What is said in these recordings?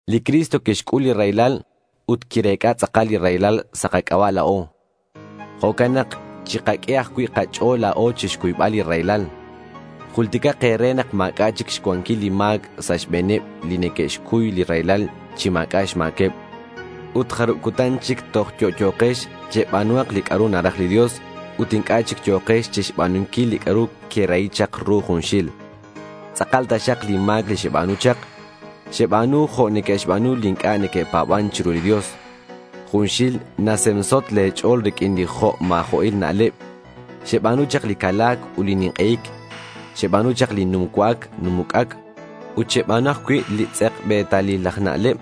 Li Cristo quixc'ul li raylal ut quirec'a tz'akal li raylal sa' kac'aba' la̱o. Jo'can nak chikaq'ue ajcui' kach'o̱l la̱o chixcuybal li raylal. Julticak e̱re nak ma̱c'a' chic xcuanquil li ma̱c sa' xbe̱neb li neque'xcuy li raylal chi ma̱c'a' xma̱queb. Ut jarub cutan chic toj yo'yo̱kex cheba̱nuhak li c'a'ru naraj li Dios, ut inc'a' chic yo̱kex chixba̱nunquil li c'a'ru querahi chak ru junxil. Tz'akal taxak li ma̱c li xeba̱nu chak. Xeba̱nu jo' neque'xba̱nu li inc'a' neque'pa̱ban chiru li Dios. Junxil nasemsot le̱ ch'o̱l riq'uin li jo' ma̱jo'il na'leb. Xeba̱nu chak li cala̱c ut li nink'ei̱c. Xeba̱nu chak li num cua'ac num uc'ac. Ut xeba̱nu ajcui' li tz'ekbe̱talil aj na'leb.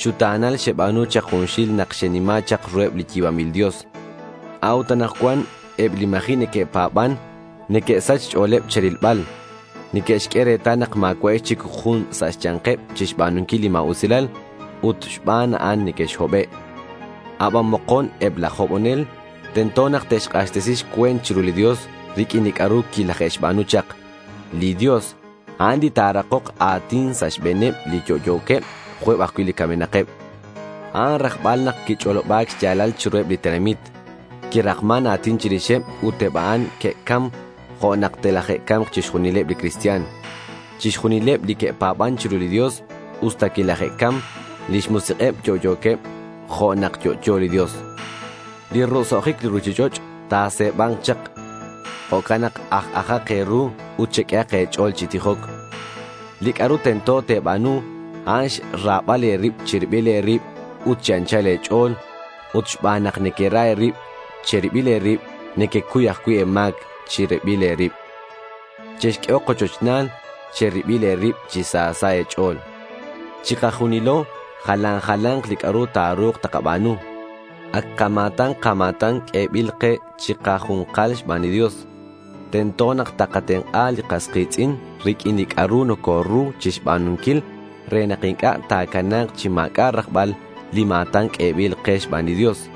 Xuta̱nal xeba̱nu chak junxil nak xenima chak ruheb li yi̱banbil Dios. A'ut anakcuan eb li ma̱ji' neque'pa̱ban neque'sach xch'o̱leb che̱rilbal. Neque'xq'ue retal nak ma̱cua'ex chic jun sa' xya̱nkeb chixba̱nunquil li ma̱usilal. Ut xban a'an nequexhobe'. Aban mokon eb laj hobonel tento nak te'xk'axtesi xcue̱nt chiru li Dios riq'uin li c'a'ru quilaje'xba̱nu chak. Li Dios, a'an li ta̱rakok a̱tin sa' xbe̱neb li yo'yo̱queb jo' eb ajcui' li camenakeb. A'an rajbal nak quich'oloba̱c xya̱lal chiruheb li tenamit. Quirakman a̱tin chirixeb ut eb a'an que'cam jo' nak telaje'ca̱mk chixjunileb li cristian. Chixjunileb li que'pa̱ban chiru li Dios usta quilaje'cam, lix musik'eb yo'yo̱queb jo' nak yo'yo li Dios. Li roso'jic li ruchich'och' ta̱se̱ba̱nk chak. Jo'can nak aj-ajak e̱ru, ut cheq'uehak e̱ch'o̱l chi tijoc. Li c'a'ru tento te̱ba̱nu, a'an xra̱bal e̱rib che̱ribil e̱rib ut chi anchal e̱ch'o̱l. Ut xban nak nequera e̱rib che̱ribil e̱rib, nequecuy ajcui' e̱ma̱c che̱ribil e̱rib. Chexq'uehok ochochna̱l che̱ribil e̱rib chi sa sa' e̱ch'o̱l. Chikajunilo jalan jala̱nk li c'a'ru ta̱ru̱k takaba̱nu. Ac kama̱tan kama̱tan q'uebil ke chikaju̱nkal xban li Dios. Tento nak takatenk'a li kas ki̱tz'in riq'uin li c'a'ru nocoru chixba̱nunquil re nak inc'a' ta̱cana̱k chi ma̱c'a' rajbal li ma̱tan q'uebil ke xban li Dios.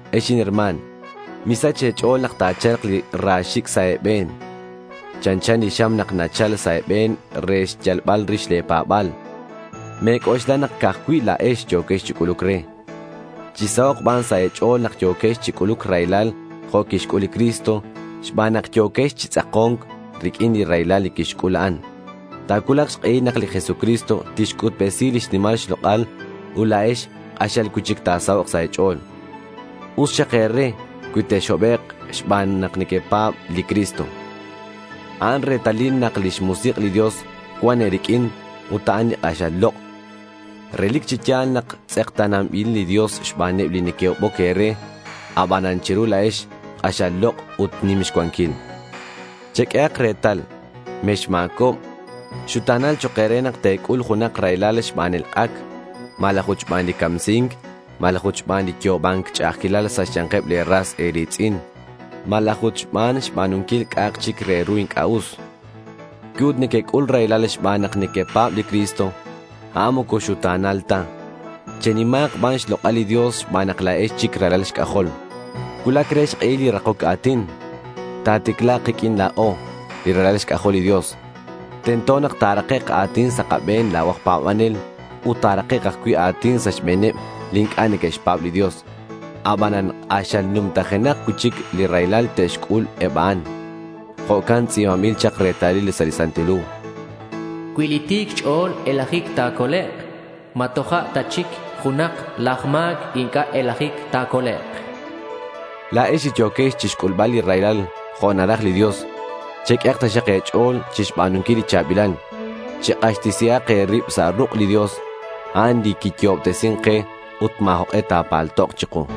Ex inherma̱n, misach e̱ch'o̱l nak ta̱cha̱lk li ra xi̱c' sa' e̱be̱n. Chanchan li xam nak nachal sa' e̱be̱n re xyalbal rix le̱ pa̱ba̱l. Me̱c'oxla nak ca'aj cui' la̱ex yo̱quex chi c'uluc re. Chi sahok' ban sa' e̱ch'o̱l nak yo̱quex chi c'uluc raylal jo' quixc'ul li Cristo xban nak yo̱quex chi tz'ako̱nc riq'uin li raylal li quixc'ul a'an. Ta̱cuulak xk'ehil nak li Jesucristo tixc'utbesi lix nimal xlok'al ut la̱ex k'axal cui'chic ta̱sahok' sa' e̱ch'o̱l. Us xak e̱re cui texhobek' xban nak nequepa̱b li Cristo. A'an retalil nak lix Musik' li Dios cuan e̱riq'uin ut a'an li k'axal lok'. Relic chi ya̱l nak tz'ekta̱nanbil li Dios xbaneb li neque'hoboc e̱re, abanan che̱ru la̱ex, k'axal lok' ut nim xcuanquil. Cheq'uehak retal: mexma̱cob. Xuta̱nal chok' e̱re nak te̱c'ul junak raylal xban elk'ac, malaj ut xban li camsi̱nc, malaj ut xban li yo'oba̱nc ch'a'ajquilal sa' xya̱nkeb le̱ ras e̱ri̱tz'in, malaj ut xban xba̱nunquil c'a'ak chic re ru inc'a' us. Cui ut nequec'ul raylal xban nak nequepa̱b li Cristo, a'an moco xuta̱nal ta. Chenima̱k ban xlok'al li Dios xban nak la̱ex chic ralal xc'ajol. Cuulac re xk'ehil li rakoc a̱tin. Ta̱ticla̱k kiq'uin la̱o, li ralal xc'ajol li Dios. Tento nak ta̱rakek' a̱tin sa' kabe̱n la̱o aj pa̱banel. Ut ta̱rakek' ajcui' a̱tin sa' xbe̱neb li inc'a' neque'xpa̱b li Dios. Abanan k'axal numtajenak cui'chic li raylal te'xc'ul eb a'an. Jo'ca'in tz'i̱banbil chak retalil sa' li Santil Hu: Cui li ti̱c xch'o̱l elajic ta̱colek', ¿ma toja' ta chic junak laj ma̱c inc'a' elajic ta̱colek'? La̱ex li yo̱quex chi xc'ulbal li raylal jo' naraj li Dios, cheq'uehak taxak e̱ch'o̱l chixba̱nunquil li cha̱bilal. Chek'axtesihak e̱rib sa' ruk' li Dios. A'an li quiyo'obtesin ke ut ma̱ jok'e ta̱paltok chiku.